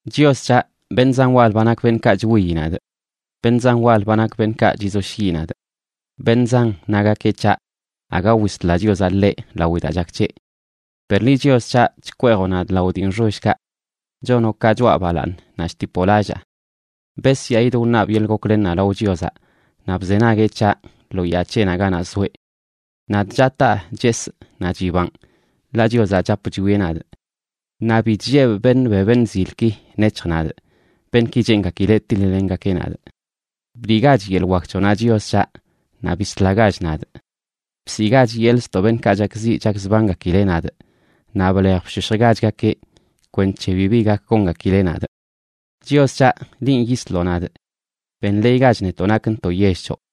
Chios c̱haꞌ, beṉꞌ zan wal ba nak beṉꞌkaꞌ chwiyi nadꞌ. Beṉꞌ zan wal ba nak beṉꞌkaꞌ chizoshyiꞌ nadꞌ. Beṉꞌ zan nagakeꞌ c̱haꞌ: “Aga wisla Chiozaꞌ ḻeꞌ lawi daa chak c̱heꞌ.” Per liꞌ Chios c̱haꞌ, chkweejoꞌ nadꞌ lao dii nxollkaꞌ; chonoꞌ ka choꞌa balaaṉ naꞌ chtipoꞌ lallaa. Besyaꞌidꞌ wṉabꞌ yeḻꞌ goklennaꞌ lao Chiozaꞌ, naꞌ bzenagueꞌ c̱haꞌ lo yaa c̱heꞌnaꞌ ganaꞌ zoeꞌ. Nadꞌ chataa chesꞌ, naꞌ chibanꞌ, ḻaꞌ Chiozaꞌ chap chwieꞌ nadꞌ. Naꞌ bi chllebꞌ beṉꞌ be beṉꞌ zilki nec̱hj nadꞌ, beṉꞌki cheengakileꞌ tiḻ-lengakeꞌ nadꞌ. ¡Bliꞌgach yeḻꞌ wak c̱hoꞌnaꞌ, Chios c̱haꞌ, naꞌ bislagach nadꞌ! Bsiꞌgach yeḻꞌ ztoꞌ beṉꞌkaꞌ chakziꞌ chakzbangakileꞌ nadꞌ, naꞌ blej bshoshjgachgakeꞌ kwenc̱he bibi gak gongakileꞌ nadꞌ. Chios c̱haꞌ, linꞌ yisloꞌ nadꞌ. Benḻeeygach netoꞌ nakntoꞌ yell c̱hoꞌ.